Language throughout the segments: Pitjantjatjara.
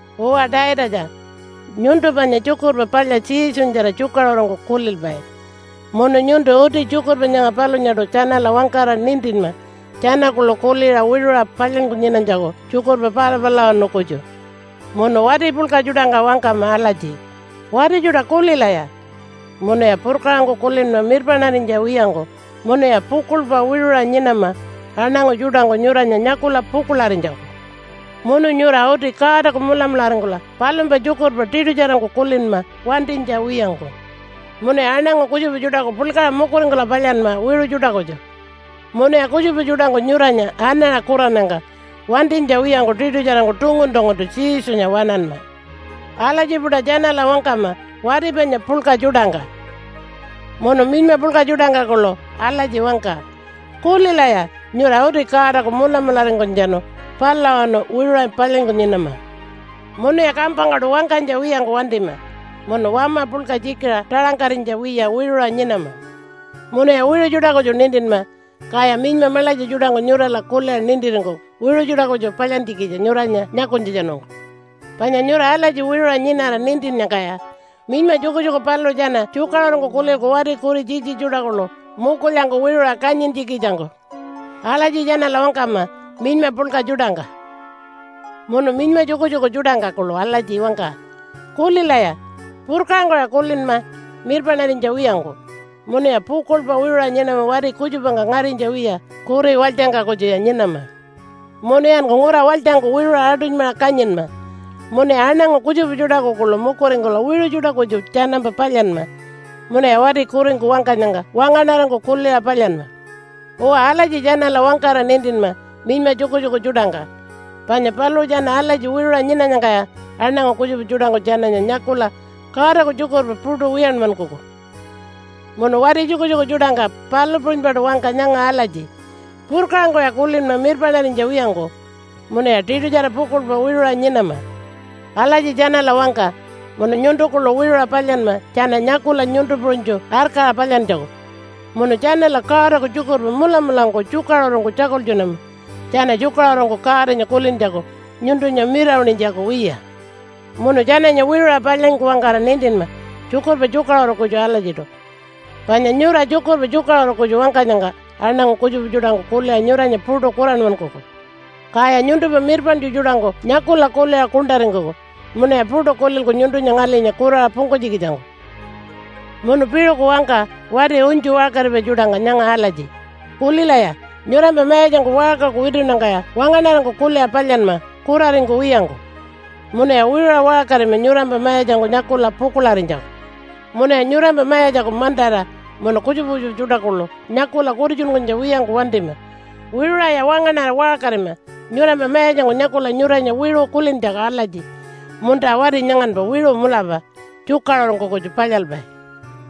Uwa Taitatja, nyuntu panya Tjukurpa Palya Jesunyatjara tjukaṟurungku kulilpai, munu nyuntu uti tjukurpa nyanga palunyaṯu tjanala wangkara nintinma tjana kuḻu kuliṟa wiṟuṟa palyanyku nyinanytjaku tjukurpa pala palulawanu kutju. Munu wati puḻka tjuṯangka wangkama alatji, “Wati tjuṯa kulilaya! Munuya purkaṟangku kulinma mirpaṉarinytja wiyangku munuya pukuḻpa wiṟuṟa nyinama aṉangu tjuṯangku nyuranya nyakula pukuḻarinytjaku. Munu nyura uti Godaku mulamularingkula palumpa tjukurpa tiṯutjarangku kulinma wantinytja wiyangku. Munuya aṉangu kutjupa tjuṯaku puḻkaṟa mukuringkula palyanma wiṟu tjuṯa kutju. Munuya kutjupa tjuṯangku nyuranya anaṟa kurannyangka wantinytja wiyangku tiṯutjarangku tungun-tunguntu Jesunya waṉanma.” Alatji-puṯa tjanala wangkama wati panya puḻka tjuṯangka. Munu minyma puḻka tjuṯangka kuḻu alatji wangka, “Kulilaya! Nyura uti Godaku mulamularingkunytjatjanu palulawanu wiṟuṟa palyanyku nyinama. Munuya kampangkaṯu wangkanytja wiyangku wantima, munu wama puḻka tjikiṟa taṟangkarinytja wiya wiṟuṟa nyinama. Munuya wiṟu tjuṯa kutju nintinma, kaya minyma maḻatja tjuṯangku nyurala kuliṟa nintiringkuku wiṟu tjuṯa kutju palyantjikitja nyuranya nyakunytjatjanungku. Panya nyura alatji wiṟuṟa nyinara nintinnyangkaya minyma tjukutjuku paluṟu tjana tjukaṟurungku kulilku wati kuri tjitji tjuṯa kuḻu mukulyangku wiṟuṟa kanyintjikitjangku.” Alatji tjanala wangkama minyma puḻka tjuṯangka. Munu minyma tjukutjuku tjuṯangka kuḻu alatji wangka, “Kulilaya! Purkaṟangkuya kulinma mirpaṉarinytja wiyangku, munuya pukuḻpa wiṟuṟa nyinama wati kutjupangka ngarinytja wiya kuri walytjangka kutjuya nyinama. Munuyanku ngura walytjangku wiṟuṟa aṯunymaṟa kanyinma, munuya aṉangu kutjupa tjuṯaku kuḻu mukuringkula wiṟu tjuṯa kutju tjanampa palyanma. Munuya wati kuringku wangkanyangka wangaṉarangku kuliṟa palyanma.” Uwa alatji tjanala wangkara nintinma minyma tjukutjuku tjuṯangka. Panya paluṟu tjana alatji wiṟuṟa nyinanyangkaya aṉangu kutjupa tjuṯangku tjananya nyakula Godaku tjukurpa puṯu wiyanmankuku. Munu wati tjukutjuku tjuṯangka palu puṟunypaṯu wangka nyanga alatji, “Purkaṟangkuya kulinma mirpaṉarinytja wiyangku, munuya tiṯutjara pukuḻpa wiṟuṟa nyinama.” Alatji tjanala wangka munu nyuntu kuḻu wiṟuṟa palyanma tjana nyakula nyuntu puṟunytju arkaṟa palyantjaku. Munu tjanala Godaku tjukurpa mulamulangku tjukaṟurungku tjakultjunama tjana tjukaṟurungku Godanya kulintjaku, nyuntunya mirawaṉinytjaku wiya. Munu tjananya wiṟuṟa palyanyku wangkara nintinma tjukurpa tjukaṟuru kutju alatjiṯu. Panya nyura tjukurpa tjukaṟuru kutju wangkanyangka aṉangu kutjupa tjuṯangku kuliṟa nyuranya puṯu kuranmankuku. Kaya nyuntumpa mirpaṉtju tjuṯangku nyakula kuliṟa kuṉṯaringkuku munuya puṯu kulilku nyuntunya ngalinya kuraṟa pungkunytjikitjangku. Munu piṟuku wangka wati unytju waṟkaripai tjuṯangka nyanga alatji, “Kulilaya, nyurampa mayatjangku waṟkaku witunnyangkaya wangaṉarangku kuliṟa palyanma kuraringkuwiyangku. Munuya wiṟuṟa waṟkarima nyurampa mayatjangku nyakula pukuḻarinytjaku. Munuya nyurampa mayatjaku mantara munu kutjupa kutjupa tjuṯa kuḻu nyakula kutitjunkunytja wiyangku wantima. Wiṟuṟaya wangaṉara waṟkarima nyurampa mayatjangku nyakula nyuranya wiṟu kulintjaku alatji, ‘Munta wati nyanganpa wiṟu mulapa, tjukaṟurungku kutju palyalpai.’”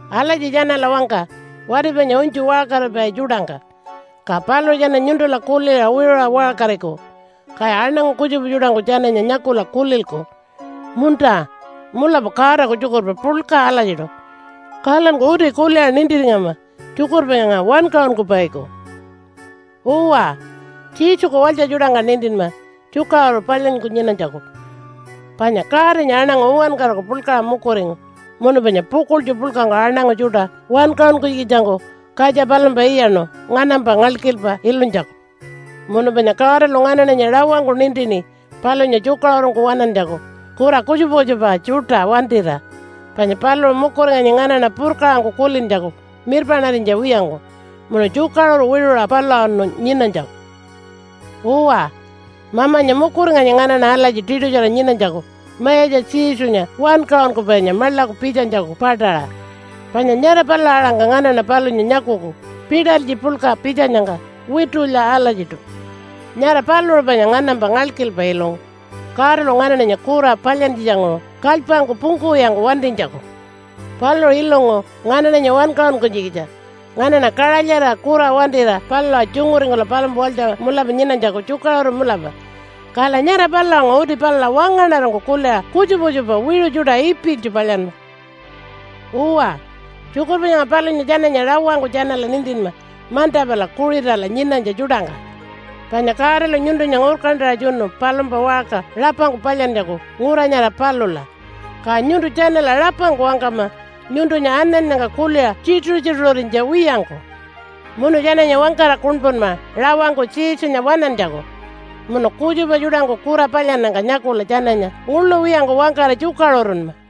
Alatji tjanala wangka wati panya unytju waṟkaripai tjuṯangka, ka paluṟu tjana nyuntula kuliṟa wiṟuṟa waṟkariku, kaya aṉangu kutjupa tjuṯangku tjananya nyakula kulilku, “Munta, mulapa Godaku tjukurpa puḻka alatjiṯu, kalanku uti kuliṟa nintiringama tjukurpa nyanga wankaṟunkupaiku.” Uwa, Jesuku walytja tjuṯangka nintinma tjukaṟuru palyanyku nyinanytjaku, panya Godanya aṉangu uwankaraku puḻkaṟa mukuringu munu panya pukuḻtju puḻkangku aṉangu tjuṯa wankaṟunkunytjikitjangku katja palumpa iyaṉu nganampa ngalkilpa ilunytjaku. Munu panya Godalu nganaṉanya rawangku nintini palunya tjukaṟurungku waṉantjaku kura kutjupa kutjupa tjuṯa wantira. Panya paluṟu mukuringanyi nganaṉa purkaṟangku kulintjaku mirpaṉarinytja wiyangku, munu tjukaṟuru wiṟuṟa palulawanu nyinanytjaku. Uwa, Mamanya mukuringanyi nganaṉa alatji tiṯutjara nyinanytjaku Mayatja Jesunya Wankaṟunkupainya maḻaku pitjanytjaku paṯaṟa. Panya nyara palula aṟangka nganaṉa palunya nyakuku pitalytji puḻka pitjanyangka witulya alatjiṯu. Nyara paluṟu panya nganampa ngalkilpa ilungu Godalu nganaṉanya kura palyantjitjanguṟu kalypangku pungkuwiyangku wantinytjaku. Paluṟu ilungu nganaṉanya wankaṟunkunytjikitja nganaṉa kaṟalyarira kura wantira palula tjunguringkula palumpa walytja mulapa nyinanytjaku tjukaṟuru mulapa. Kala nyara palulanguṟu uti palula wangaṉarangku kuliṟa kutjupa kutjupa wiṟu tjuṯa ipilytju palyanma. Uwa, tjukurpa nyanga palunya tjananya rawangku tjanala nintinma manta pala Kuṟitala nyinanytja tjuṯangka. Panya Godalu nyuntunya ngurkantaṟa tjunu palumpa waṟka rapangku palyantjaku ngura nyara palula, ka nyuntu tjanala rapangku wangkama nyuntunya anannyangka kuliṟa tjituṟu-tjituṟurinytja wiyangku. Munu tjananya wangkara kuṉpunma rawangku Jesunya waṉantjaku. Munu kutjupa tjuṯangku kura palyannyangka nyakula tjananya nguḻu wiyangku wangkara tjukaṟurunma.